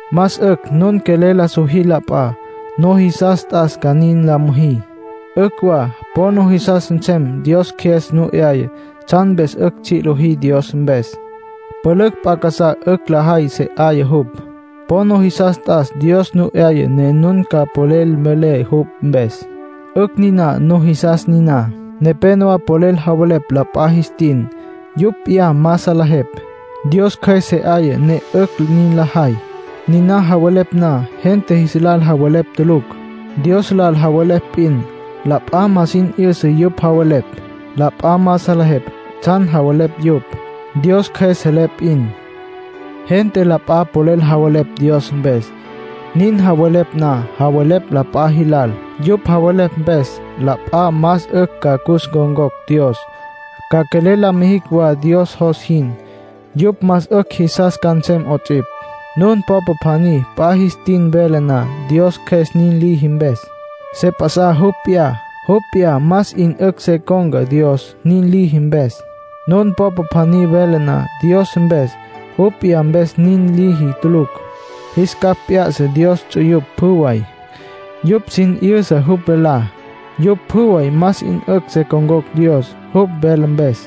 Más 'ücj nun quelel la sojí la p'a. Nujisas t'as ca nin la müjí. 'Ücj wa po nujisas nsem Dios Cjües nu 'yaya tsjan mpes 'ücj tsji' lojí Dios mpes. Pülücj p'a casá 'ücj lajay se 'aya jupj. Po nujisas t'as Dios nu 'yaya ne nun ca polel mvelé jupj mpes. 'Ücj niná nujisas niná. Nepénowa polel javelepj la p'a jis tin, yupj p'iyá ma salejepj. Dios Cjües se 'aya ne 'ücj nin lajay. Niná javelepj na, gente jis lal javelepj tulucj; Dios lal javelepj p'in. La p'a ma sin 'yüsa yupj javelepj. La p'a ma salejepj tsjan javelepj yupj; Dios Cjües selé p'in. Gente la p'a polel javelepj Dios mpes. Nin javelepj na, javelepj la p'a jilal. Yupj javelepj mpes, la p'a más 'ücj ca cus ncon̈cocj Dios, ca quelel la mijicj wa Dios jos jin, yupj más 'ücj jisas ca nsem 'ots'ipj. Nun popa pjaní p'a jis tin vele na Dios Cjües nin liji mpes, se p'a'sa jupj p'iyá. Jupj p'iyá más 'in 'ücj se con̈ca Dios, nin liji mpes. Nun popa pjaní vele na Dios mpes, jupj p'iyá mpes nin liji tulucj. Jis capj p'ya'sa Dios ts'uyupj pjü way. Yupj sin 'yüsa jupj velá. Yupj pjü way más 'in 'ücj se con̈cocj Dios, jupj vele mpes.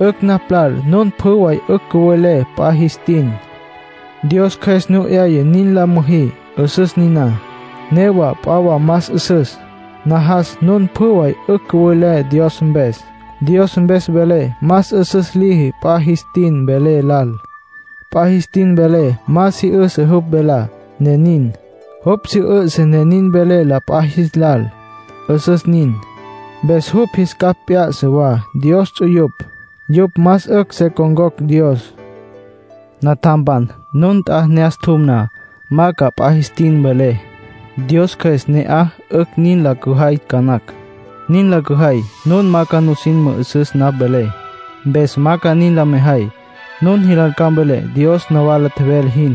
'Ücj napj lal nun pjü way 'ücj cüwelé p'a jis tin, Dios Cjües nu 'yaya nin la müjí. 'Üsüs niná. Newa p'a wa más 'üsüs. Najas nun pjü way 'ücj cüwelé Dios mpes. Dios mpes vele más 'üsüs liji p'a jis tin vele lal. P'a jis tin vele ma si 'üsǘ jupj velá, ne nin. Jupj si 'üsǘ, ne nin vele la p'a jis lal, 'üsüs nin. Mpes jupj jis capj p'ya'sa wa Dios ts'uyupj, yupj más 'ücj se con̈cocj Dios. Natjampan, nun nt'a ne'as tjum na, ma ca p'a jis tin mvelé. Dios Cjües ne 'aya 'ücj nin la cüjay ca nacj. Nin la cüjay, nun ma ca nusin mü'üsüs napj velé. Mpes ma ca nin la mejay. Nun jilal ca mvelé Dios nawala tjevele jin.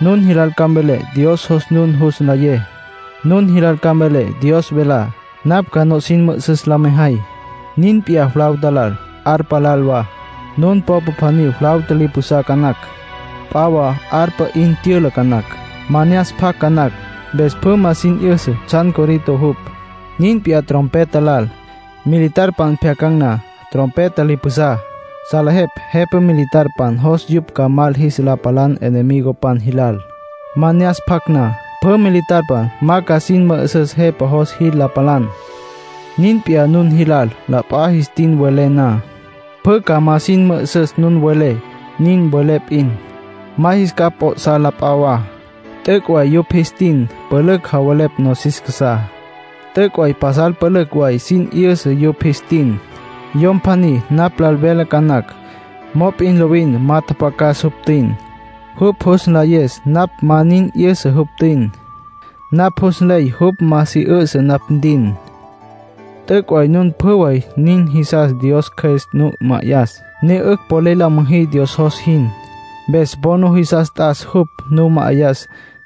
Nun jilal ca mvelé Dios jos nun jus nlayé. Nun jilal ca mvelé Dios velá. Napj ca nusin mü'üsüs le mejay. Nin p'iyá flauta lal, arpa lal wa. Nun popa pjaní flauta li pjusá ca nacj, p'a wa arpa 'in tyüla ca nacj. Ma ne'as pjac ca nacj. Mpes pjü ma sin 'yüsa tsjan corito jupj. Nin p'iyá trompeta lal. Militarpan pjyacan̈ na trompeta li pjusá, salejepj jepa militar jos yupj ca mal jis la palan enemigopan jilal. Ma ne'as pjac na, pjü militarpan ma ca sin mü'üsüs jepa jos jil la palan. Nin p'iyá nun jilal, la p'a jis tin welé na, pjü ma ca sin mü'üsüs nun welé. Nin welé p'in, ma jis capj p'o'sá la p'a wa. T'üc' way yupj jis tin pülücj javelepj nosis casá. T'üc' way pasal pülücj way sin 'yüsa yupj jis tin. Yom pjaní napj lal vele ca nacj, mop'in lovin ma tjapjacas jupj tüin. Jupj jus nlayes napj ma nin 'yüsa jupj tüin. Napj jus nley jupj ma si 'üsǘ napj ntin. T'üc' way nun pjü way nin jisas Dios Cjües nu ma'ayas, ne 'ücj polel la müjí Dios jos jin. Mpes po nujisas t'as jupj nu ma'ayas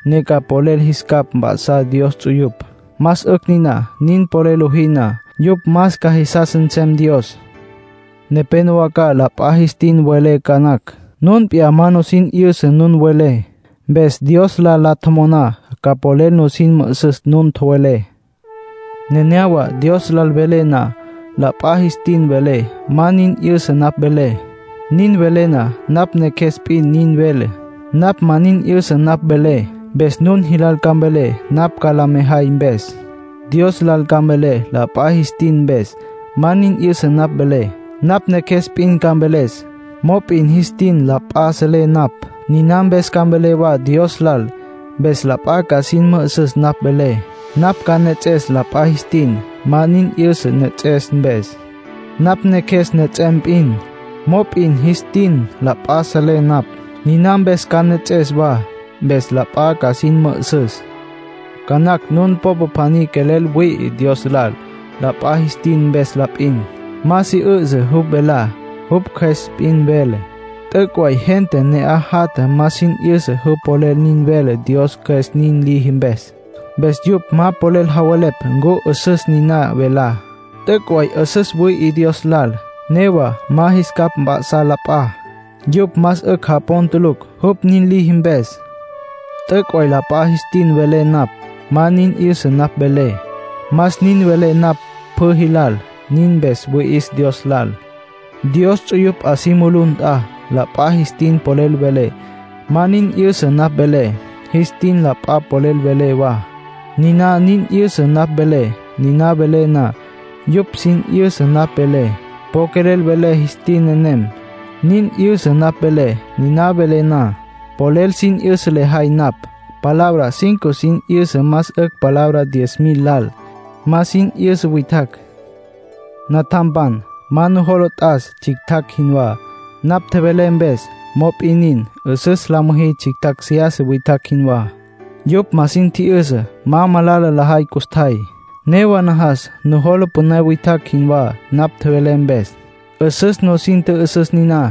ne ca polel jis capj mp'a'sá Dios ts'uyupj. Más 'ücj niná. Nin polel lojí na, yupj más ca jisas nsem Dios. Nepénowa ca la p'a jis tin welé ca nacj. Nun p'iyá ma nusin 'yüsa nun welé. Mpes Dios lal la tjomoná ca polel nusin mü'üsüs nun tjowelé. Nenéyawa Dios lal velé na, la p'a jis tin velé, ma nin 'yüsa napj velé. Nin velé na, napj neqjues p'in nin vele. Napj ma nin 'yüsa napj velé. Mpes nun jilal ca mvelé napj ca la mejay mpes. Dios lal ca mvelé la p'a jis tin mpes, ma nin 'yüsa napj velé. Napj neqjues p'in ca mveles. Mop'in jis tin la p'a selé napj. Niná mpes ca mvelé wa Dios lal. Mpes la p'a ca sin mü'üsüs napj velé. Napj ca nejets'es la p'a jis tin, ma nin 'yüsa nejets'es mpes. Napj neqjues nejets'em p'in. Mop'in jis tin la p'a selé napj. Niná mpes ca nejets'es wa. Mpes la p'a ca sin mü'üsüs. Ca nacj nun popa pjaní quelel wüi'i Dios lal la p'a jis tin mpes la p'in. Ma si 'üsǘ jupj velá. Jupj cjües p'in vele. T'üc' way gente ne'aj jatja ma sin 'yüsa jupj polel nin vele Dios Cjües nin liji mpes. Mpes yupj ma polel javelepj ncu 'üsüs niná velá. T'üc' way 'üsüs wüi'i Dios lal. Newa ma jis capj p'ya'sa la p'a. Yupj más 'ücj japon tulucj, jupj nin liji mpes. T'üc' way la p'a jis tin velé napj, ma nin 'yüsa napj velé. Más nin velé napj pjü jilal. Nin mpes wüi'is Dios lal. Dios ts'uyupj 'a si mulú nt'a, la p'a jis tin polel velé, ma nin 'yüsa napj velé. Jis tin la p'a polel velé wa, niná nin 'yüsa napj velé. Niná velé na, yupj sin 'yüsa napj velé. Po quelel velé jis tin nenem, nin 'yüsa napj velé. Niná velé na, polel sin 'yüsa lejay napj. Palabra cinco sin 'yüsa más 'ücj palabra diez mil lal, ma sin 'yüsa witjacj. Natjampan, ma nujola t'as tsjictjacj jinwá, napj tjevelé mpes. Mop'in nin, 'üsüs la müjí tsjictjacj seyasa witjacj jinwá. Yupj ma sin tji'yüsa, ma malala lajay custjay. Newa najas nujola püné witjacj jinwá napj tjevelé mpes. 'Üsüs nusin tjü'üsüs niná.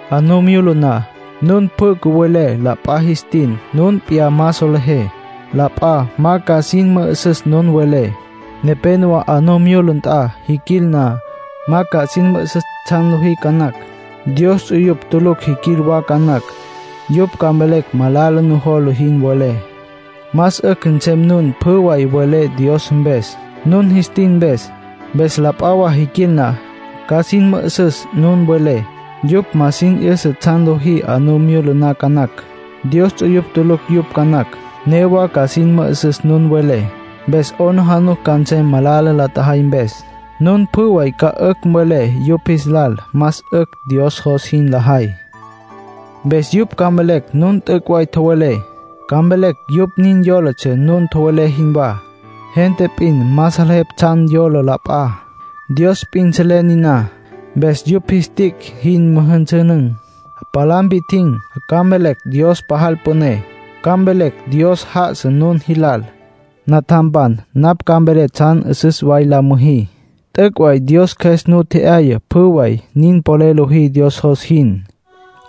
'A nu myula na, nun pjü cüwelé la p'a jis tin nun p'iyá ma solejé, la p'a ma ca sin mü'üsüs nun welé. Nepénowa 'a nu myula nt'a jiquil na, ma ca sin mü'üsüs tsjan lojí ca nacj. Dios ts'uyupj tulucj jiquil wa ca nacj. Yupj ca mvelecj malala nujola jin welé. Más 'ücj nsem nun pjü way welé Dios mpes, nun jis tin mpes. Mpes la p'a wa jiquil na, ca sin mü'üsüs nun welé. Yupj ma sin 'yüsa tsjan lojí 'a nu myula na ca nacj. Dios ts'uyupj tulucj yupj ca nacj. Newa ca sin mü'üsüs nun welé, mpes 'aplijila ca nsem malala la tjajay mpes. Nun pjü way ca 'ücj mvelé yupj jis lal más 'ücj Dios jos jin lajay. Mpes yupj ca mvelecj nun t'üc' way tjowelé. Ca mvelecj yupj nin yólatsja nun tjowelé jinwá. Gente p'in ma salejepj tsjan yola la p'a. Dios p'in selé niná. Mpes yupj jis tic' jin müjünsünün̈, palá mpi'tjin̈, ca mvelecj Dios pajal püné. Ca mvelecj Dios já'asa nun jilal. Natjampan, napj ca mvelé tsjan 'üsüs way la müjí. T'üc' way Dios Cjües nu tje'yaya pjü way, nin polel lojí Dios jos jin.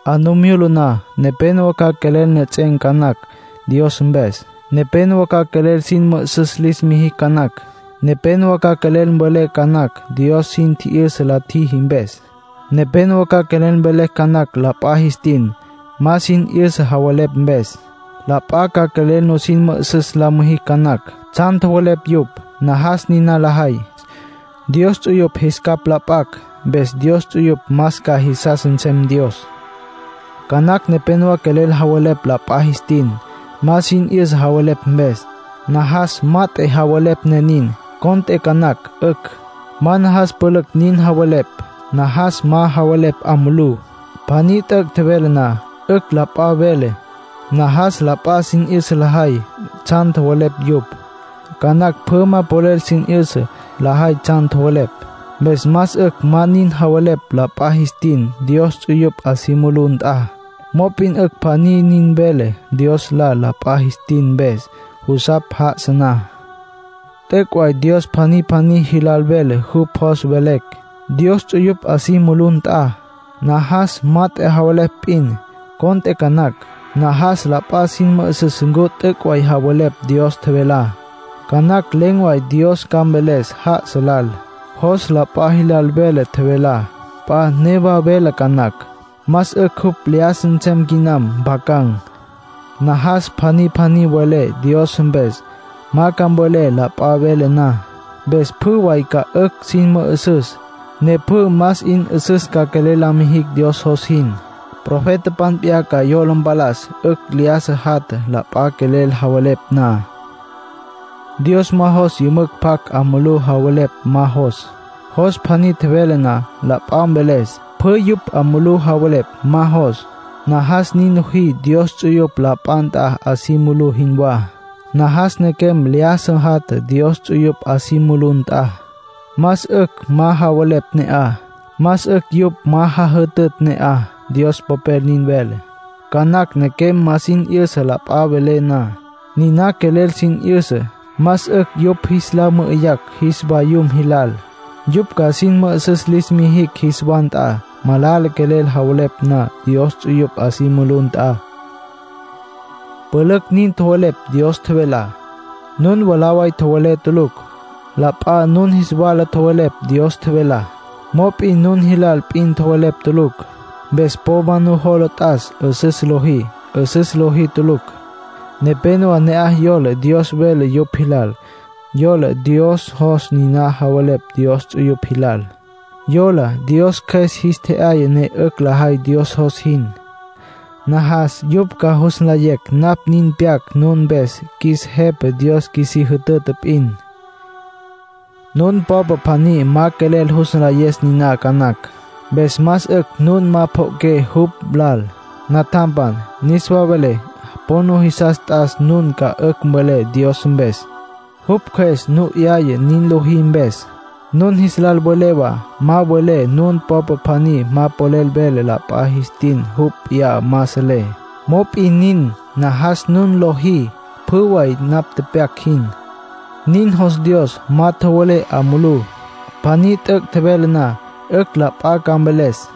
'A nu myula na, nepénowa ca quelel nejets'en̈ ca nacj Dios mpes. Nepénowa ca quelel sin mü'üsüs lis mijicj ca nacj. Nepénowa ca quelel mvelecj ca nacj Dios sin tji'yüsa la tjiji mpes. Nepénowa ca quelel mvelecj ca nacj la p'a jis tin, ma sin 'yüsa javelepj mpes. La p'a ca quelel nusin mü'üsüs la numijicj ca nacj, tsjan tjowelepj yupj. Najas niná lajay, Dios ts'uyupj jis capj la p'acj. Mpes Dios ts'uyupj más ca jisas nsem Dios. Ca nacj nepénowa quelel javelepj la p'a jis tin, ma sin 'yüsa javelepj mpes. Najas mat'e javelepj ne nin, cont'e ca nacj 'ücj. Ma najas pülücj nin javelepj. Najas ma javelepj 'a mulú. Pjaní t'üc' tjevele na, 'ücj la p'a vele. Najas la p'a sin 'yüsa lajay tsjan tjowelepj yupj. Ca nacj pjü ma polel sin 'yüsa lajay tsjan tjowelepj. Mpes más 'ücj ma nin javelepj la p'a jis tin Dios ts'uyupj 'a si mulú nt'a. Mop'in 'ücj pjaní nin vele Dios lal la p'a jis tin mpes, jusapj já'asa na. T'üc' way Dios pjaní pjaní jilal vele jupj jos mvelecj, Dios ts'uyupj 'a si mulú nt'a. Najas mat'e javelepj p'in, cont'e ca nacj. Najas la p'a sin mü'üsüs ncu t'üc' way javelepj Dios tjevelá. Ca nacj len̈ way Dios ca mveles já'asa lal. Jos la p'a jilal vele tjevelá. P'a newa vele ca nacj. Más 'ücj jupj lyájasa nsem quinam, mpjacam. Najas pjaní pjaní welé Dios mpes; ma ca mvelé la p'a vele na. Mpes pjü way ca 'ücj sin mü'üsüs, ne pjü más 'in 'üsüs ca quelel la mijicj Dios jos jin. Profetapan p'iyá ca yola mpalas 'ücj lyájasa jatja, la p'a quelel javelepj na. Dios ma jos yümücj pjac, 'a mulú javelepj ma jos. Jos pjaní tjevele na, la p'a mveles. Pjü yupj 'a mulú javelepj, ma jos. Najas nin lojí Dios ts'uyupj la p'a nt'a 'a si mulú jinwá. Najas nequem lyájasa jatja Dios ts'uyupj 'a si mulú nt'a. Más 'ücj ma javelepj ne'aj. Más 'ücj yupj ma jajütütj ne'aj. Dios Popel nin vele. Ca nacj nequem ma sin 'yüsa la p'a vele na. Niná quelel sin 'yüsa. Más 'ücj yupj jis la mü'üyacj jis vayum jilal, yupj ca sin mü'üsüs lis mijicj jis wa nt'a. Malala nequem javelepj Dios ts'uyupj 'a si mulú nt'a. Pülücj nin tjowelepj Dios tjevelá. Nun mwalá way tjowelepj tulucj. La p'a nun jis wala tjowelepj Dios tjevelá. Mop'in nun jilal p'in tjowelepj tulucj. Mpes po ma nujola t'as 'üsüs lojí; 'üsüs lojí tulucj. Nepénowa ne'aj yola Dios vele yupj jilal, yola Dios jos niná javelepj Dios ts'uyupj jilal. Yola Dios Cjües jis tje'yaya ne 'ücj lajay Dios jos jin. Najas yupj ca jus nlayecj napj nin pyac nun mpes qjuis Jepa Dios qjuisí jütüta p'in. Nun popa pjaní ma quelel jus nlayes niná ca nacj. Mpes más 'ücj nun ma pjo'oqué jupj lal. Natjampan, niswa velé po nujisas t'as nun ca 'ücj mvelé Dios mpes, jupj Cjües nu 'yaya nin lojí mpes. Nun jis lal velé wa ma mvelé nun popa pjaní ma polel vele la p'a jis tin jupj p'iyá ma selé. Mop'in nin, najas nun lojí pjü way napj tepyac jin. Nin jos Dios. Ma tjowelé 'a mulú. Pjaní t'üc' tjevele na, 'ücj la p'a ca mveles.